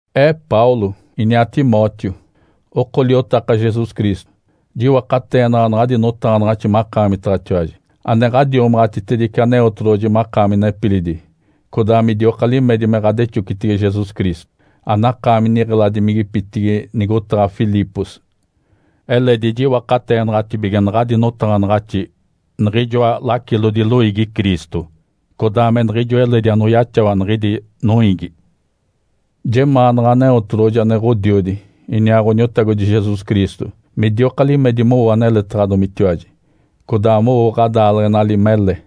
Ee Paulo, iniaa Timóteo, oko liotaka Jesus Cristo. Jiwakateenaɡ̶a naɡ̶adi notaɡ̶anaɡ̶axi makaamitaɡ̶atiwaji, ane ɡ̶adiomaɡ̶atitedice Aneotedoɡ̶oji makaami nepilidi, codaa midioka limedi me ɡ̶adexocitege Jesus Cristo, anakaami niɡ̶eladimigipitigi nigotaɡ̶a Filipos. Eledi jiwakateenaɡ̶atibige naɡ̶adi notaɡ̶anaɡ̶axi niɡ̶ijoa lacilodi loiigi Cristo, codaa me niɡ̶ijo eledi anoyaxawa niɡ̶idi noiigi. Jemaanaɡ̶a Aneotedoɡ̶oji ane Ǥodiodi iniaa Ǥoniotagodi Jesus Cristo midioka limedi mowo aneletaɡ̶adomitiwaji, codaa mowo ɡ̶adaaleɡ̶enali mele.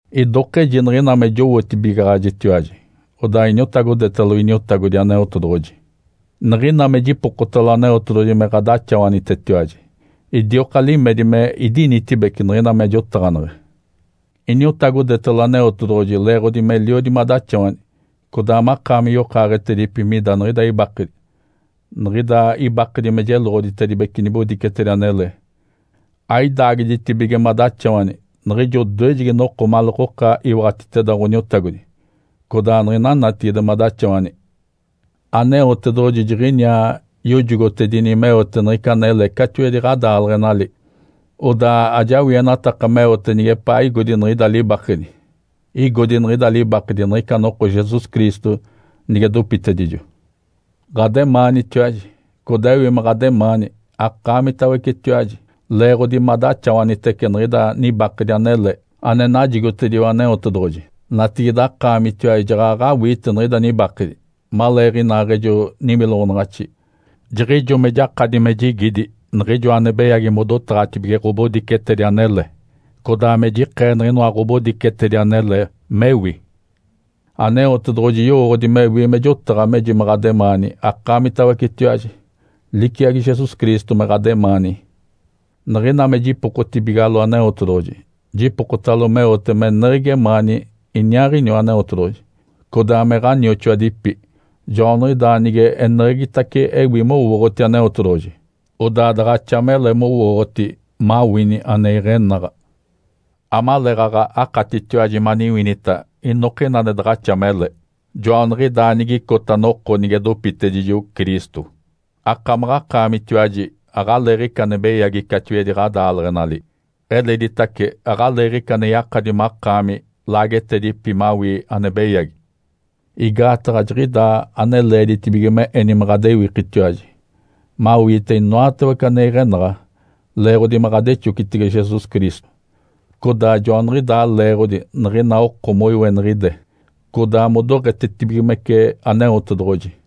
Idokeji niɡ̶ina me jowootibigaɡ̶ajitiwaji, odaa iniotagodetalo Iniotagodi Aneotedoɡ̶oji. Niɡ̶ina me jipokotalo Aneotedoɡ̶oji me ɡ̶adaxawanitetiwaji, idioka limedi me idinitibeci niɡ̶ina me jotaɡ̶aneɡ̶e. Iniotagodetalo Aneotedoɡ̶oji leeɡ̶odi meliodi madaxawani, codaa makaami yokaaɡ̶etedipi mida niɡ̶ida ibakedi. Niɡ̶ida ibakedi me jeloɡ̶oditedibece nibodicetedi anele. Aidaagiditibige madaxawani niɡ̶ijo odoejegi noko maleekoka iwaɡ̶atiteda Ǥoniotagodi codaa niɡ̶ina natigide madaxawani. Aneotedoɡ̶oji jiɡ̶iniaa yojogotedini meote niɡ̶ica anele catiwedi ɡ̶adaaleɡ̶enali. Odaa ajawienataka meote nigepaa igodi niɡ̶ida libakedi. Igodi niɡ̶ida libakedi niɡ̶ica noko Jesus Cristo nige dopitedijo. Ǥademaanitiwaji. Codaa ewi me ɡ̶ademaani akaamitawecetiwaji, leeɡ̶odi madaxawanitece niɡ̶ida nibakedi anele ane najigotediwa Aneotedoɡ̶oji. Natigide akaamitiwaji jaɡ̶aɡ̶a awiite niɡ̶ida nibakedi, maleeɡ̶inaaɡ̶ejo niwiloɡ̶onaɡ̶axi, jiɡ̶ijo me jakadi me jigidi niɡ̶ijoa ane beyagi modotaɡ̶atibige ɡ̶obodicetedi anele, codaa me jikee niɡ̶inoa ɡ̶obodicetedi anele, mewi. Aneotedoɡ̶oji yowooɡ̶odi mewi me jotaɡ̶a meji me ɡ̶ademaani akaamitawecetiwaji, liciagi Jesus Cristo me ɡ̶ademaani. Niɡ̶ina me jipokotibigalo Aneotedoɡ̶oji, jipokotalo meote meneɡ̶egi emaani iniaaɡ̶iniwa Aneotedoɡ̶oji, codaa me ɡ̶anioxoadipi. Joaniɡ̶idaa nige eneɡ̶egitace ewi mowooɡ̶oti Aneotedoɡ̶oji, odaa daɡ̶axa mele mowooɡ̶oti mawini ane iɡ̶enaɡ̶a. Amaleeɡ̶aɡ̶a akatitiwaji maniwinita inokina ane daɡ̶axa mele. Joaniɡ̶idaa nigicota noko nige dopitedijo Cristo, akamaɡ̶akaamitiwaji aɡ̶aleeɡ̶ica ane beyagi catiwedi ɡ̶adaaleɡ̶enali. Eleditace aɡ̶aleeɡ̶ica ane yakadi makaami laagetedipi mawii ane beyagi. Igaataɡ̶a jiɡ̶idaa ane leeditibige me eni me ɡ̶adewikitiwaji, mawiite inoatawece ane iɡ̶enaɡ̶a leeɡ̶odi me ɡ̶adexocitege Jesus Cristo. Codaa joaniɡ̶idaa leeɡ̶odi niɡ̶ina oko moiweniɡ̶ide, codaa modoɡ̶etetibigimece Aneotedoɡ̶oji.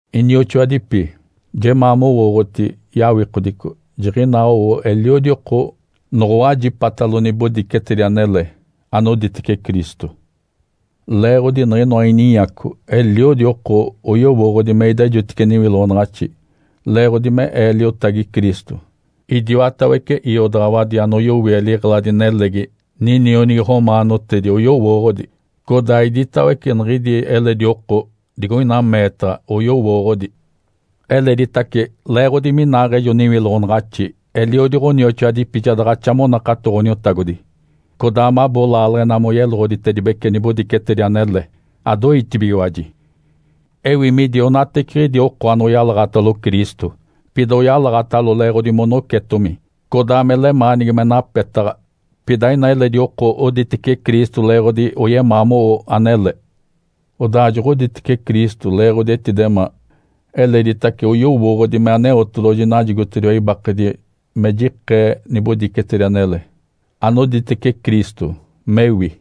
Inioxoadipi, jemaa mowooɡ̶oti yawikodico jiɡ̶inaa owo eliodi oko noɡ̶owajipatalo nibodicetedi anele, anoditece Cristo. Leeɡ̶odi niɡ̶inoa ininyaco, eliodi oko oyowooɡ̶odi me idejotice niwiloɡ̶onaɡ̶axi leeɡ̶odi me ee liotagi Cristo. Idiwatawece iodaɡ̶awadi anoyowie liɡ̶eladi-nelegi ninionigi romaanotedi oyowooɡ̶odi, codaa iditawece niɡ̶idi eledi oko digoina meetaɡ̶a oyowooɡ̶odi. Eleditace leeɡ̶odi minaaɡ̶ejo niwiloɡ̶onaɡ̶axi, eliodi ɡ̶onioxoadipi ja daɡ̶axa monakato Ǥoniotagodi, codaa mabo laaleɡ̶ena moyeloɡ̶oditedibece nibodicetedi anele, adoitibigiwaji. Ewi midi onateceɡ̶idi oko anoyeloɡ̶oditece Cristo, pida oyeloɡ̶odi leeɡ̶odi monocetomi, codaa me lemaanigi me napetaɡ̶a. Pida ina eledi oko oditece Cristo leeɡ̶odi oyemaa mowo anele. Odaa joɡ̶oditece Cristo leeɡ̶odi etidemaa. Eleditace oyowooɡ̶odi me Aneotedoɡ̶oji najigotediwa ibakedi me jikee nibodicetedi anele anoditece Cristo, mewi.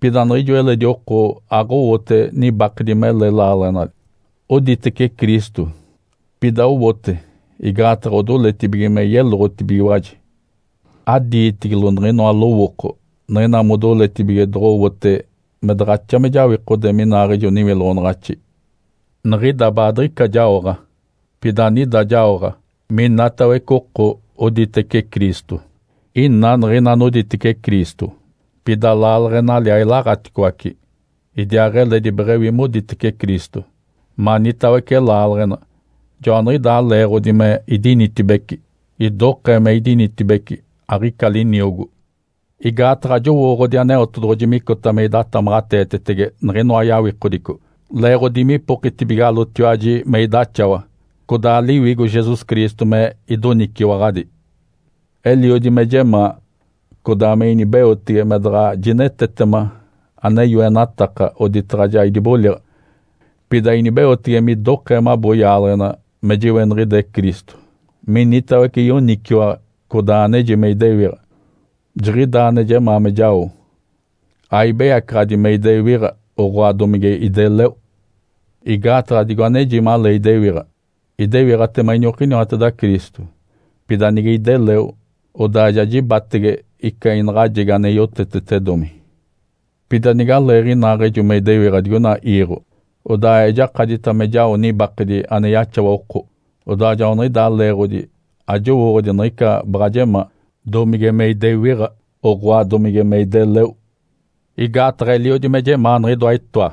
Pida niɡ̶ijo eledi oko aɡ̶owote nibakedi mele laaleɡ̶enali, oditece Cristo, pida owote igaataɡ̶a odoletibige me yeloɡ̶otibigiwaji. Adiitigilo niɡ̶inoa lowooko niɡ̶ina modiletibige doɡ̶owote me daɡ̶axa me jawikode minaaɡ̶ejo niwiloɡ̶onaɡ̶axi. Niɡ̶ida baadiɡ̶ica jaoɡ̶a. Pida anida jaoɡ̶a, minatawece oko oditece Cristo, ina niɡ̶ina anoditece Cristo, pida laaleɡ̶enali ailaɡ̶aticoace, idiaaɡ̶eledi beɡ̶ewi moditece Cristo, manitawece laaleɡ̶ena. Joaniɡ̶idaa leeɡ̶odi me idinitibeci. Idokee me idinitibeci, aɡ̶ica liniogo. Igaataɡ̶a jowooɡ̶odi Aneotedoɡ̶oji micota me idatamaɡ̶ateetetema niɡ̶inoa yawikodico leeɡ̶odi me ipokitibigalotiwaji me idaxawa, codaa Liwigo Jesus Cristo me idoniciwaɡ̶adi. Eliodi me jemaa, codaa me inibeotege me daɡ̶a jinetetema ane yoenataka oditaɡ̶a ja idiboliɡ̶a, pida inibeotege midokee mabo yaaleɡ̶ena me jiweniɡ̶ide Cristo minitawece yoniciwaɡ̶a, codaa aneji me idewiɡ̶a. Jiɡ̶idaa ane jemaa me jao, aibeyacaɡ̶adi me idewiɡ̶a, oɡ̶oa, domige ideleo. Igaataɡ̶a digo aneji malee idewiɡ̶a, idewiɡ̶atema iniokiniwateda Cristo, pida nige ideleo, odaa ja jibatege ica inaɡ̶ajegi ane yotetetedomi. Pida nigalee inaaɡ̶ejo me idewiɡ̶a digoina iiɡ̶o, odaa ejakadita me jao nibakedi ane yaxawa oko. Odaa joaniɡ̶idaa leeɡ̶odi ajowooɡ̶odi niɡ̶ica baɡ̶a jemaa, domige me idewiɡ̶a, oɡ̶oa, domige me ideleo. Igaataɡ̶a eliodi me jemaa niɡ̶idoa itoa.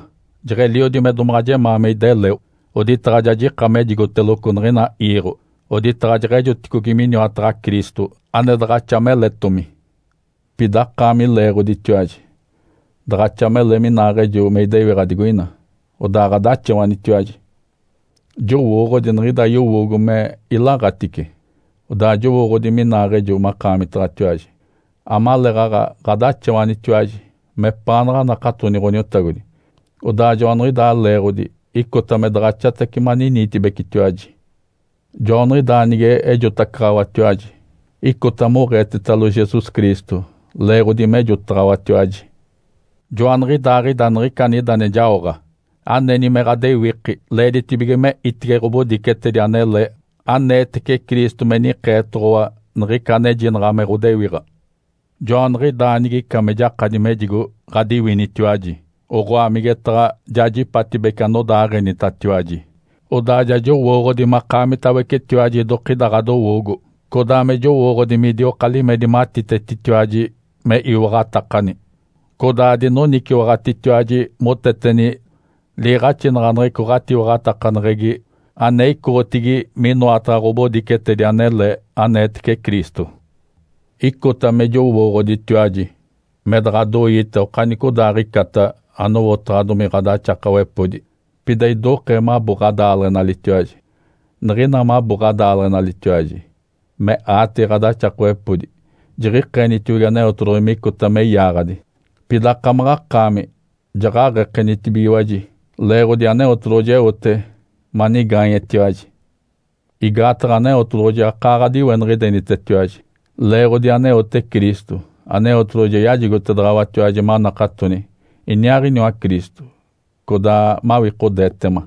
Jeɡ̶eliodi me domaɡ̶a jemaa me ideleo, oditaɡ̶a ja jika mejigoteloco niɡ̶ina iiɡ̶o, oditaɡ̶a jeɡ̶ejoticogi miniwataɡ̶a Cristo, ane daɡ̶axa meletomi. Pida akaami leeɡ̶oditiwaji, daɡ̶axa mele minaaɡ̶ejo me idewiɡ̶a digoina, odaa ɡ̶adaxawanitiwaji. Jowooɡ̶odi niɡ̶ida yowoogo me ilaɡ̶atice. Odaa jowooɡ̶odi minaaɡ̶ejo makaamitaɡ̶atiwaji, amaleeɡ̶aɡ̶a ɡ̶adaxawanitiwaji mepaanaɡ̶a anakatoni Ǥoniotagodi. Odaa joaniɡ̶idaa leeɡ̶odi icota me daɡ̶axatace maniniitibecitiwaji. Joaniɡ̶idaa nige ejotacaɡ̶awatiwaji, icota moɡ̶eetetalo Jesus Cristo, leeɡ̶odi mejotaɡ̶awatiwaji. Joaniɡ̶idaaɡ̶ida niɡ̶ica anida jaoɡ̶a, aneni me ɡ̶adewiki leeditibige me itege ɡ̶obodicetedi anele aneetece Cristo me nikeetoɡ̶owa niɡ̶ica anejinaɡ̶a me ɡ̶odewiɡ̶a. Joaniɡ̶idaa nigica me jakadi mejigo ɡ̶adiwinitiwaji, oɡ̶oa, migetaɡ̶a jajipatibece anodaaɡ̶enitatiwaji, odaa ja jowooɡ̶odi makaamitawecetiwaji idokida ɡ̶adowoogo, codaa me jowooɡ̶odi midioka limedi matitetitiwaji me iwaɡ̶atakani, codaa adinoniciwaɡ̶atitiwaji moteteni liiɡ̶axinaɡ̶aneɡ̶eco ɡ̶atiwaɡ̶atakaneɡ̶egi ane icoɡ̶otigi minoataɡ̶a ɡ̶obodicetedi anele, aneetece Cristo. Icota me jowooɡ̶oditiwaji me daɡ̶adoiita okanicodaaɡ̶icata anowotaɡ̶adomi ɡ̶adaxakawepodi, pida idokee mabo ɡ̶adaaleɡ̶enalitiwaji. Niɡ̶ina mabo ɡ̶adaaleɡ̶enalitiwaji me aatege ɡ̶adaxakawepodi jiɡ̶ikeenitiogi Aneotedoɡ̶oji micota me yaaɡ̶adi, pida akamaɡ̶akaami jaɡ̶aɡ̶ekenitibigiwaji, leeɡ̶odi Aneotedoɡ̶oji eote manigaanyetiwaji. Igaataɡ̶a Aneotedoɡ̶oji akaa ɡ̶adiweniɡ̶idenitetiwaji. Leeɡ̶odi aneote Cristo, Aneotedoɡ̶oji ja yajigotedaɡ̶awatiwaji manakatoni iniaaɡ̶iniwa Cristo, codaa mawikodeetema.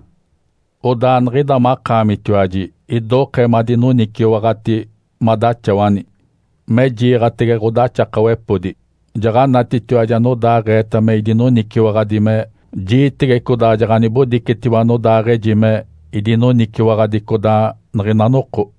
Odaa niɡ̶ida makaamitiwaji idokee madinoniciwaɡ̶ati madaxawani me jiiɡ̶atege ɡ̶odaxakawepodi. Jaɡ̶anatitiwaji anodaaɡ̶eeta me idinoniciwaɡ̶adi me jiitege codaa jaɡ̶anibodicetiwa anodaaɡ̶eji me idinoniciwaɡ̶adi codaa niɡ̶ina noko.